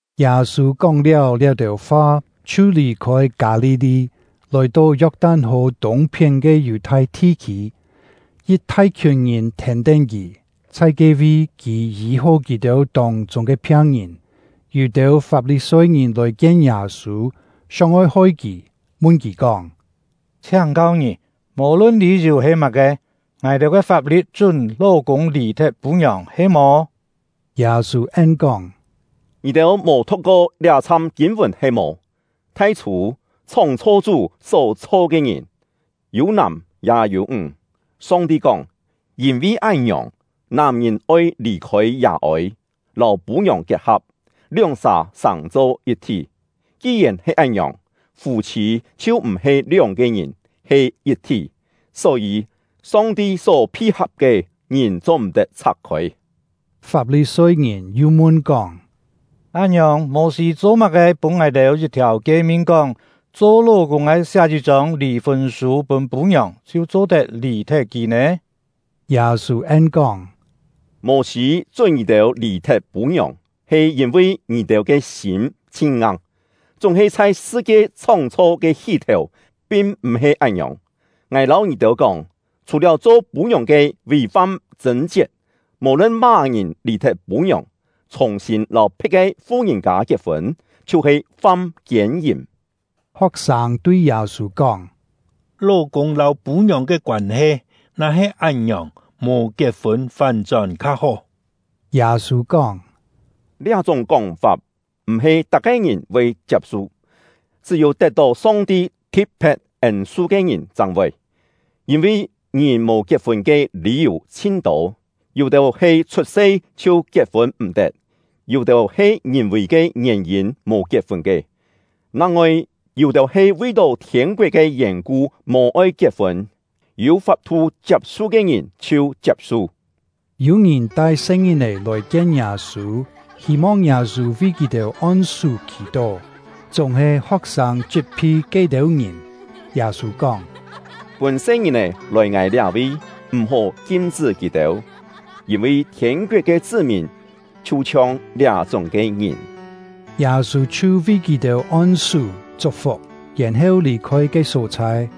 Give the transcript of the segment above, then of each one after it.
Yâ-sû kóng-liáu liá-têu fa, chhiu lì-khôi Kâ-li-li, lòi-to Yok-tan-hò tûng-phién ke Yù-thai thi-khî. Yit thai-khiùn ngìn thèn-tén kì; chhai ke-vi, kì yî-hó kì-têu tông-chûng ke phiang-ngìn. Yû-têu Fap-li-soi-ngìn lòi-kien Yâ-sû, sióng-oi hoi kì, mun kì kóng: “Chhiáng-kau ngì, mò-lun lî-yù he má-ke, ngài-têu ke fap-li̍t chún ló-kûng lì-thet pû-ngiòng, he-mò?” Yâ-sû en-kóng: “Ngì-têu mò thu̍k-ko liá-chham kîn-vùn he-mò? Thai-chhû, chhóng-chho Chú só-chho ke ngìn, ‘yû nàm ya yû ńg’. Song-ti kóng: ‘Yîn-vi án-ngiòng, nàm-ngìn oi lì-khôi yà-ôi, lâu pû-ngiòng kiet-ha̍p, lióng-sà sàng-cho yit-thí.’ Ki-yèn he án-ngiòng, fû-chhî chhiu m̀-he lióng-ke ngìn, he yit-thí. Só-yî, Song-ti só phi-ha̍p ke, ngìn cho-m̀-tet chhak-khôi.” Fap-li-soi-ngìn yu mun-kóng: “Án-ngiòng, Mô-sî cho-má-ke pûn ngài-têu yit-thiàu kie-min kóng, cho ló-kûng ke siá yit-chông lì-fûn sû pûn pû-ngiòng chhiu cho-tet lì-thet kì nè?” Yâ-sû en-kóng: “Mô-sî chún ngì-têu lì-thet pû-ngiòng, he yîn-vi ngì-têu ke sîm chhin-ngang; chúng-he chhai sṳ-kie chhóng-chho ke hí-thèu pin m̀-he án-ngiòng. Ngài lâu ngì-têu kóng, chhù-liáu cho pû-ngiòng ke vì-fam chṳ̂n-chiet, mò-lun má-ngìn lì-thet pû-ngiòng, chhùng-sîn lâu phe̍t ke fu-ngìn-kâ kiet-fûn, chhiu-he fam kiên-yìm.” Ho̍k-sâng tui Yâ-sû kóng: “Ló-kûng lâu pû-ngiòng ke koân-he na-he án-ngiòng, mò kiet-fûn fán-chón kha-hó.” Yâ-sû kóng: “Liá-chúng kóng-fap m̀-he tak-ke ngìn voi chiap-su, chṳ́-yû tet-tó Song-ti thi̍t-phe̍t ên-su ke ngìn chang voi. Yîn-vi ngìn mò kiet-fûn ke lî-yù chhin-tô: Yû-têu he chhut-se chhiu kiet-fûn m̀-tet; yû-têu he ngìn-vì ke ngièn-yîn mò kiet-fûn ke; nang-ngoi yû-têu he vi-tó thiên-koet ke yèn-ku mò-oi kiet-fûn. Yû fap-thu chiap-su ke ngìn chhiu chiap-su.” Yû ngìn tai se-ngìn-è lòi-kien Yâ-sû, hî-mong Yâ-sû vi kì-têu on-sú khì-tó; chúng-he ho̍k-sâng chit-phi ke-têu ngìn. Yâ-sû kóng: “Pûn se-ngìn-è lòi ngài liá-vi, m̀-hó kim-chṳ́ kì-têu, yîn-vi thiên-koet ke chṳ́-mìn chhiu-chhiong liá-chúng ke ngìn.” Yâ-sû chhiu vi kì-têu on-sú chuk-fuk, yèn-heu lì-khôi ke só-chhai.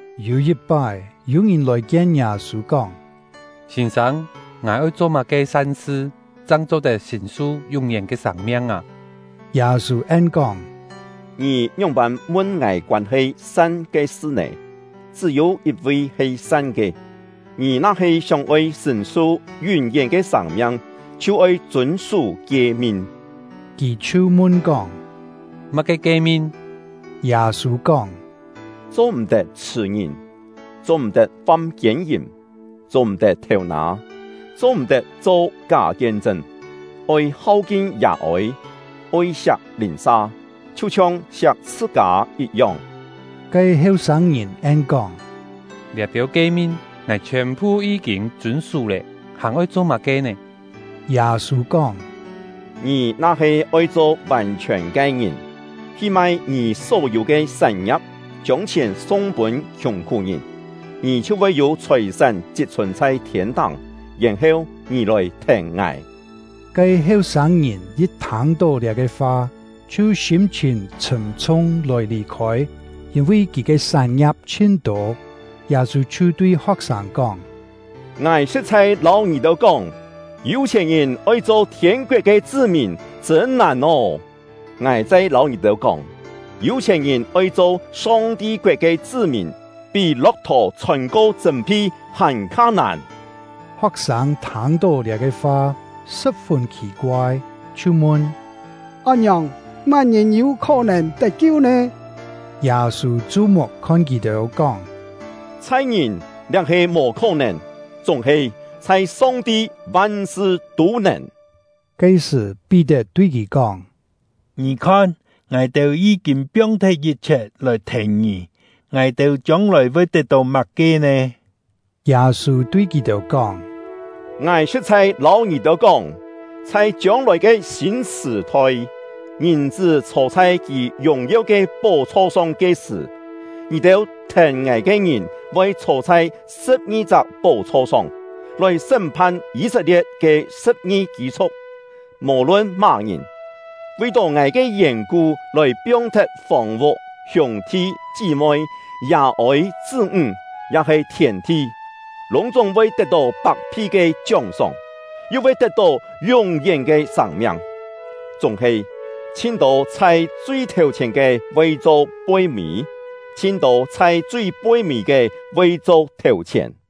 Yû yit-pái, yû-ngìn lòi-kien Yâ-sû, kóng: “Sîn-sâng, ngài oi cho má-ke san-sṳ chang cho-tet sṳ̀n-su yún-yén ke sâng-miang â?” Yâ-sû en-kóng: “Ngì ngióng-pân mun ngài koân-he ‘san’ ke sṳ nè? Chṳ́-yû yit-vi he san ke. Ngì na-he sióng-oi sṳ̀n-su yún-yén ke sâng-miang, chhiu-oi chûn-sú kie-min.” Kì chhiu mun-kóng: “Má-ke kie-min?” Yâ-sû kóng: “Cho-m̀-tet chhṳ̀-ngìn; cho-m̀-tet fam kiên-yìm; cho-m̀-tet thêu-nâ; cho-m̀-tet cho ká kien-chṳn; oi hau-kin yà-ôi; oi siak lìn-sa, chhiu-chhiong siak chhṳ-kâ yit-yong.” Ke heu-sâng-ngìn en-kóng: “Liá-têu kie-min, ngài chhiòn-phu yí-kîn chûn-sú lé, hàn-oi cho má-ke nè?” Yâ-sû kóng: “Ngì na-he oi cho vàn-chhiòn ke ngìn, hi mai ngì só-yû ke sán-ngia̍p, chiông chhièn sung-pûn khiùng-khú-ngìn, ngì chhiu voi yû chhòi-sán chit-chhùn chhai thiên-táng; yèn-heu ngì lòi thèn ngài.” Ke heu-sâng-ngìn yit thâng-tó liá-ke fa, chhiu sîm-chhìn chhṳ̀m-chhung lòi lì-khôi, yîn-vi kì ke sán-ngia̍p chhin-tô. Yâ-sû chhiu tui ho̍k-sâng kóng: “Ngài sṳ̍t-chhai lâu ngì-têu kóng, yû-chhièn-ngìn oi cho thiên-koet ke chṳ́-mìn, chṳ̂n nàn ô! Ngài chai lâu ngì-têu kóng, yû-chhièn-ngìn oi cho Song-ti koet ke chṳ́-mìn, pí lo̍k-thò chhôn-ko chṳ̂m-phi hàn-kha nàn!” Ho̍k-sâng thâng-tó liá-ke fa, sṳ̍p-fûn khì-koai, chhiu mun: “Án-ngiòng, má-ngìn yû khó-nèn tet-kiu nè?” Yâ-sû chu-muk khon kì-têu, kóng: “Chhai ngìn liá he mò khó-nèn, chúng-he chhai Song-ti van-sṳ tû nèn.” Ke-sṳ̀, Pí-tet tui kì kóng: “Ngì khon, ngài-têu yí-kîn piong-thet yit-chhiet lòi thèn ngì, ngài-têu chiông-lòi voi tet-tó má-ke nè?” Yâ-sû tui kì-têu kóng: “Ngài sṳ̍t-chhai lâu ngì-têu kóng, chhai chiông-lòi ke sîn sṳ̀-thoi, Ngìn-chṳ́ chhô chhai kì yùng-yeu ke pó-chho song ke sṳ̀, ngì-têu thèn ngài ke ngìn voi chhô chhai sṳ̍p-ngi-chak pó-chho song, lòi sṳ́m-phan Yî-set-lie̍t ke sṳ̍p-ngi kî-chhu̍k. Mò-lun má-ngìn, vi-tó ngài ke yèn-ku lòi piong-thet fòng-vuk, hiûng-thi, chí-moi, yà-ôi, chṳ́-ńg, ya-he thièn-thi, lûng-chúng voi tet-tó pak-phi ke chióng-sóng, yu voi tet-tó yún-yén ke sâng-miang. Chúng-he, chhin-tô chhai chui thèu-chhièn ke voi cho poi-mî; chhin-tô chhai chui poi-mî ke voi cho thèu-chhièn.”